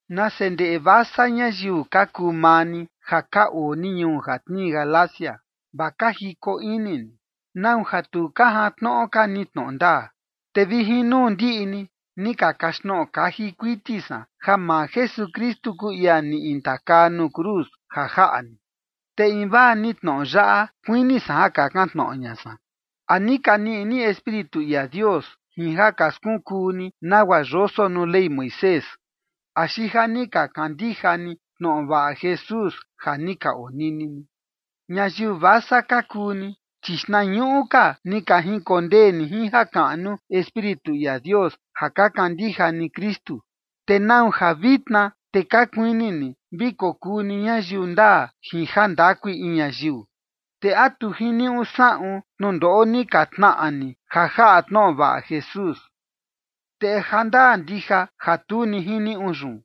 Nase ndeꞌe vasa ñayiu ka kuu maa ni ja ka oo ni ñuu ja tnii Galacia, vaa ka jiko ini ni, ¿nau ja tu ka jantnoꞌo ka ni tnoꞌo ndaa? Te vi jin nuu ndiꞌi ni, ni ka kaxtnoꞌo kaji kuiti san ja maa Jesukristu kuu ia ni intakaa nuu cruz ja jaꞌa ni. Te invaa ni tnoꞌo yaꞌa kuini san ja kakan tnoꞌo ña san: ¿A ni ka niꞌi ni Espíritu ia Dios jin ja ka skunkuu ni nagua yoso nuu Ley Moisés, axi ja ni ka kandija ni tnoꞌo vaꞌa Jesús ja ni ka onini ni? ¡Ñayiu vasa ka kuu ni! Chi xtnañuꞌu ka ni ka jinkondee ni jin jakaꞌnu Espíritu ia Dios ja ka kandija ni Kristu. ¿Te nau ja vitna te ka kuini ni vi kokuu ni ñayiu ndaa jin jandakui in ñayiu? ¿Te a tu ni jiniuꞌu saꞌun tnundoꞌo ni ka tnaꞌa ni ja jaꞌa tnoꞌo vaꞌa Jesús? ¿Te a jandaa ndija ja tu ni jiniuꞌu yun?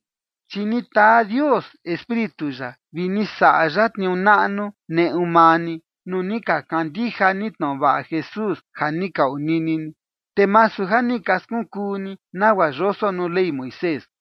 Chi ni taa Dios Espíritu ya vi ni saꞌa ya tniuu naꞌnu neꞌu maa ni, nuu ni ka kandija ni tnoꞌo vaꞌa Jesús ja ni ka onini ni, te masu ja ni ka skunkuu ni nagua yoso nuu Ley Moisés.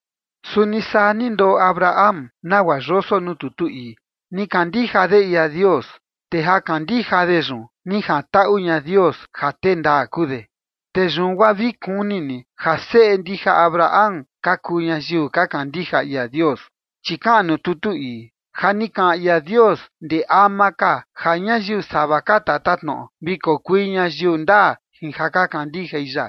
Suni saa ni ndoꞌo Abraham nagua yoso nuu tutu ii: “Ni kandija de ia Dios, te ja kandija de yun ni jantaꞌu ña Dios ja tee ndaa kuu de”. Te yun guaa vi kuni ni ja seꞌe ndija Abraham ka kuu ñayiu ka kandija ia Dios. Chi kaꞌan nuu tutu ii, ja ni kaꞌan ia Dios ndee ama ka ja ñayiu sava ka tatatnoꞌo vi kokui ñayiu ndaa jin ja ka kandijai ya,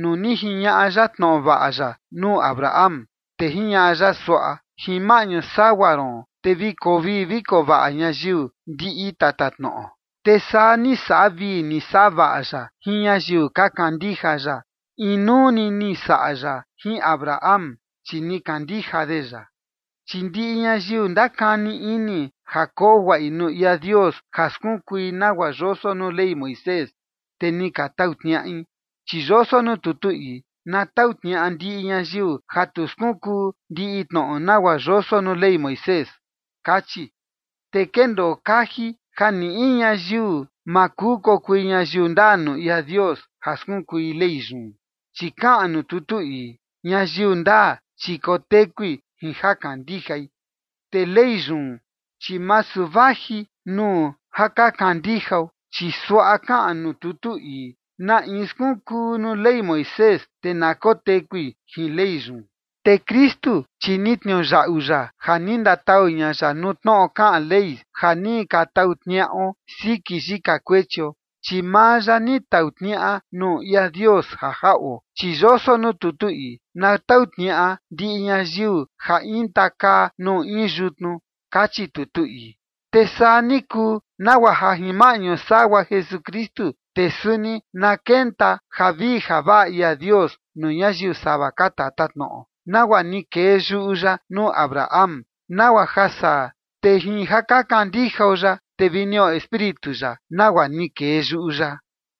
nuu ni jiñaꞌa ya tnoꞌo vaꞌa ya nuu Abraham, te jiñaꞌa ya suaꞌa: “Jin maꞌñu sagua ron te vi koo vii vi koo vaꞌa ñayiu ndiꞌi tatatnoꞌo”. Te saa ni saꞌa vii ni saꞌa vaꞌa ya jin ñayiu ka kandija ya, inuu ni ni saꞌa ya jin Abraham, chi ni kandija de ya. Chi ndiꞌi ñayiu ndakani ini ja koo guaꞌi nuu ia Dios ja skunkui nagua yoso nuu Ley Moisés, te ni ka tau tniaꞌi, chi yoso nuu tutu ii: “Na tau tniaꞌa ndiꞌi ñayiu ja tu skunkuu ndiꞌi tnoꞌo nagua yoso nuu Ley Moisés”, kachi. Te kendoo kaji ja ni in ñayiu ma kuu kokui ñayiu ndaa nuu ia Dios ja skunkui Ley yun, chi kaꞌan nuu tutu ii: “Ñayiu ndaa, chi kotekui jin ja kandijai”. Te Ley yun, chi masu vaji nuu ja ka kandijao, chi suaꞌa kaꞌan nuu tutu ii: “Na in skunkuu nuu Ley Moisés, te na kotekui jin Ley yun”. Te Kristu, chi ni tniuyaꞌu ya ja ni ndatau ña ya nuu tnoꞌo kaꞌan Ley ja ni ka tau tniaꞌo siki yika kuechio, chi maa ya ni tau tniaꞌa nuu ia Dios ja jaꞌo, chi yoso nuu tutu ii: “Na tau tniaꞌa ndiꞌi ñayiu ja intakaa nuu in yutnu”, kachi tutu ii. Te saa ni kuu, nagua ja jin maꞌñu sagua Jesukristu, te suni na kenta javii javaꞌa ia Dios nuu ñayiu sava ka tatatnoꞌo, nagua ni kee yuꞌu ya nuu Abraham, nagua ja saa te jin ja ka kandijao ya, te vi niꞌo Espíritu ya, nagua ni kee yuꞌu ya.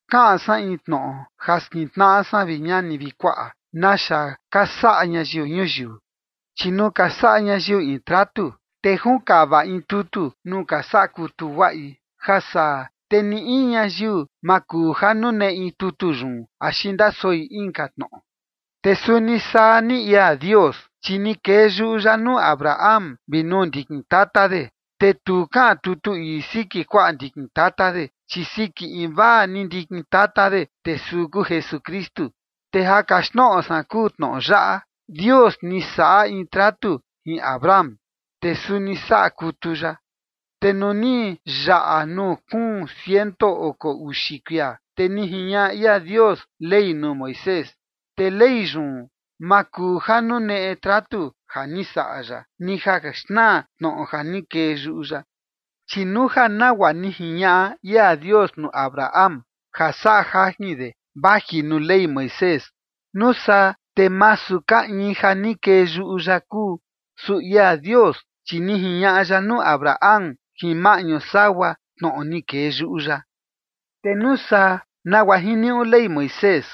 Kaꞌan san in tnoꞌo ja skintnaꞌa san, vi ñani vi kuaꞌa, naxa ka saꞌa ñayiu ñuyiu. Chi nuu ka saꞌa ñayiu in tratu, te junkava in tutu nuu ka saꞌa kutu guaꞌi, ja saa te ni in ñayiu ma kuu ja nuneꞌi tutu yun axi ndasoi inka tnoꞌo. Te suni saa ni ia Dios, chi ni kee yuꞌu ya nuu Abraham vi nuu ndikin tata de. Te tu kaꞌan tutu ii siki kuaꞌa ndikin tata de, chi siki invaa ni ndikin tata de, te suu kuu Jesukristu. Te ja kaxtnoꞌo san kuu tnoꞌo yaꞌa: Dios ni saꞌa in tratu jin Abraham, te suni saꞌa kutu ya. Te nuu ni yaꞌa nuu kuun ciento oko uxi kuia, te ni jiñaꞌa ia Dios Ley nuu Moisés. Te Ley yun ma kuu ja nuneꞌe tratu ja ni saꞌa ya, ni ja xnaa tnoꞌo ja ni kee yuꞌu ya. Chi nuu ja nagua ni jiñaꞌa ia Dios nuu Abraham ja saꞌa jajin de vaji nuu Ley Moisés, nuu saa te masu ka in ja ni kee yuꞌu ya kuu. Su ia Dios, chi ni jiñaꞌa ya nuu Abraham jin maꞌñu sagua tnoꞌo ni kee yuꞌu ya. Te nuu saa, ¿nagua jiniuꞌu Ley Moisés?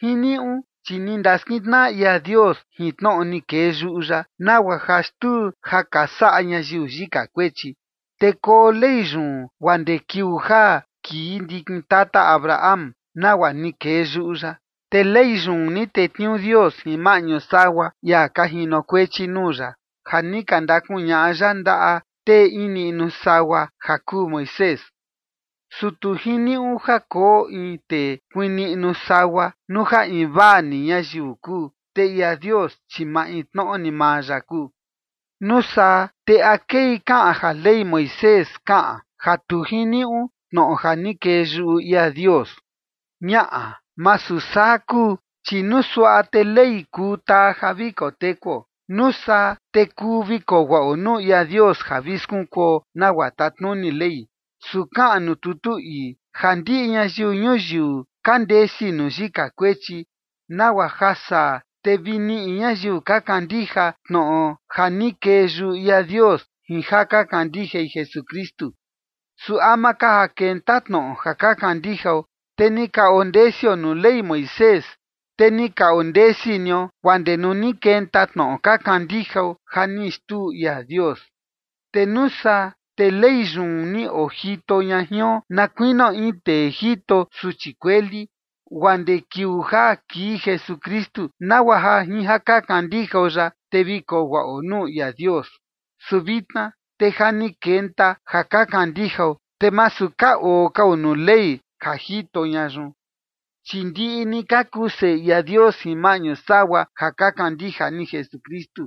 Jiniuꞌu chi ni ndaskintnaꞌa ia Dios jin tnoꞌo ni kee yuꞌu ya nagua ja xtuu ja ka saꞌa ñayiu yika kuechi. Te koo Ley yun guaa ndee kiuu ja kii ndikin tata Abraham, nagua ni kee yuꞌu ya. Te Ley yun ni tetniuu Dios jin maꞌñu sagua ia ka jinokuechi nuu ya ja ni ka ndakuñaꞌa ya ndaꞌa tee in niꞌnu sagua ja kuu Moisés. Su tu jiniuꞌu ja koo in tee kuiin niꞌnu sagua, nuu ja invaa ni ñayiu kuu, te ia Dios, chi maintnoꞌo ni maa ya kuu. ¿Nuu saa te a kei kaꞌan ja Ley Moisés kaꞌan ja tu jiniuꞌu tnoꞌo ja ni kee yuꞌu ia Dios? Ñaꞌa, masu saa kuu. Chi nuu suaꞌa, te Ley kuu taa ja vi tekuo. Nuu saa, te kuu vi koo guaꞌo nuu ia Dios ja vi skunkuo nagua tatnuni Ley. Su kaꞌan nuu tutu ii ja ndiꞌi ñayiu ñuyiu ka ndesi nuu yika kuechi, nagua ja saa, te vi niꞌi ñayiu ka kandija tnoꞌo ja ni kee yuꞌu ia Dios jin ja ka kandijai Jesukristu. Su ama ka ja kenta tnoꞌo ja ka kandijao, te ni ka ondesio nuu Ley Moisés, te ni ka ondesi nio guaa ndee nuu ni kenta tnoꞌo ka kandijao ja ni xtuu ia Dios. Te nuu saa, te Ley yun ni ojito ña jion na kuinio in tee jito suchi kueli, guaa ndee kiuu ja kii Jesukristu, nagua ja jin ja ka kandijao ya, te vi koo guaꞌo nuu ia Dios. Su vitna te ja ni kenta ja ka kandijao, te masu ka oo kao nuu Ley ja jito ña yun. Chi ndiꞌi ni ka kuu seꞌe ia Dios jin maꞌñu sagua ja ka kandija ni Jesukristu.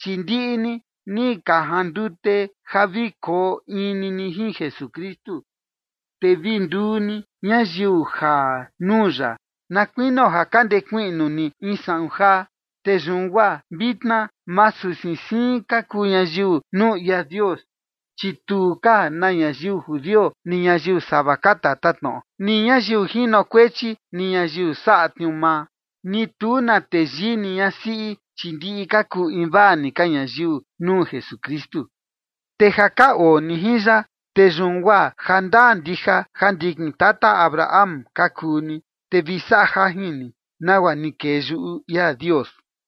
Chi ndiꞌi ni, ni ka jandute ja vi koo in ni ni jin Jesukristu, te vi nduu ni ñayiu jaa nuu ya na kuinio ja ka ndekuiꞌnu ni in saꞌun jaa. Te yun guaa vitna masu siin siin ka kuu ñayiu nuu ia Dios, chi tu ka na ñayiu judio ni ñayiu sava ka tatatnoꞌo, ni ñayiu jinokuechi ni ñayiu saꞌa tniuu maa, ni tu na teyii ni ñasiꞌi, chi ndiꞌi ka kuu invaa ni ka ñayiu nuu Jesukristu. Te ja ka oo ni jin ya, te yun guaa jandaa ndija ja ndikin tata Abraham ka kuu ni, te vi saꞌa jajin ni, nagua ni kee yuꞌu ia Dios.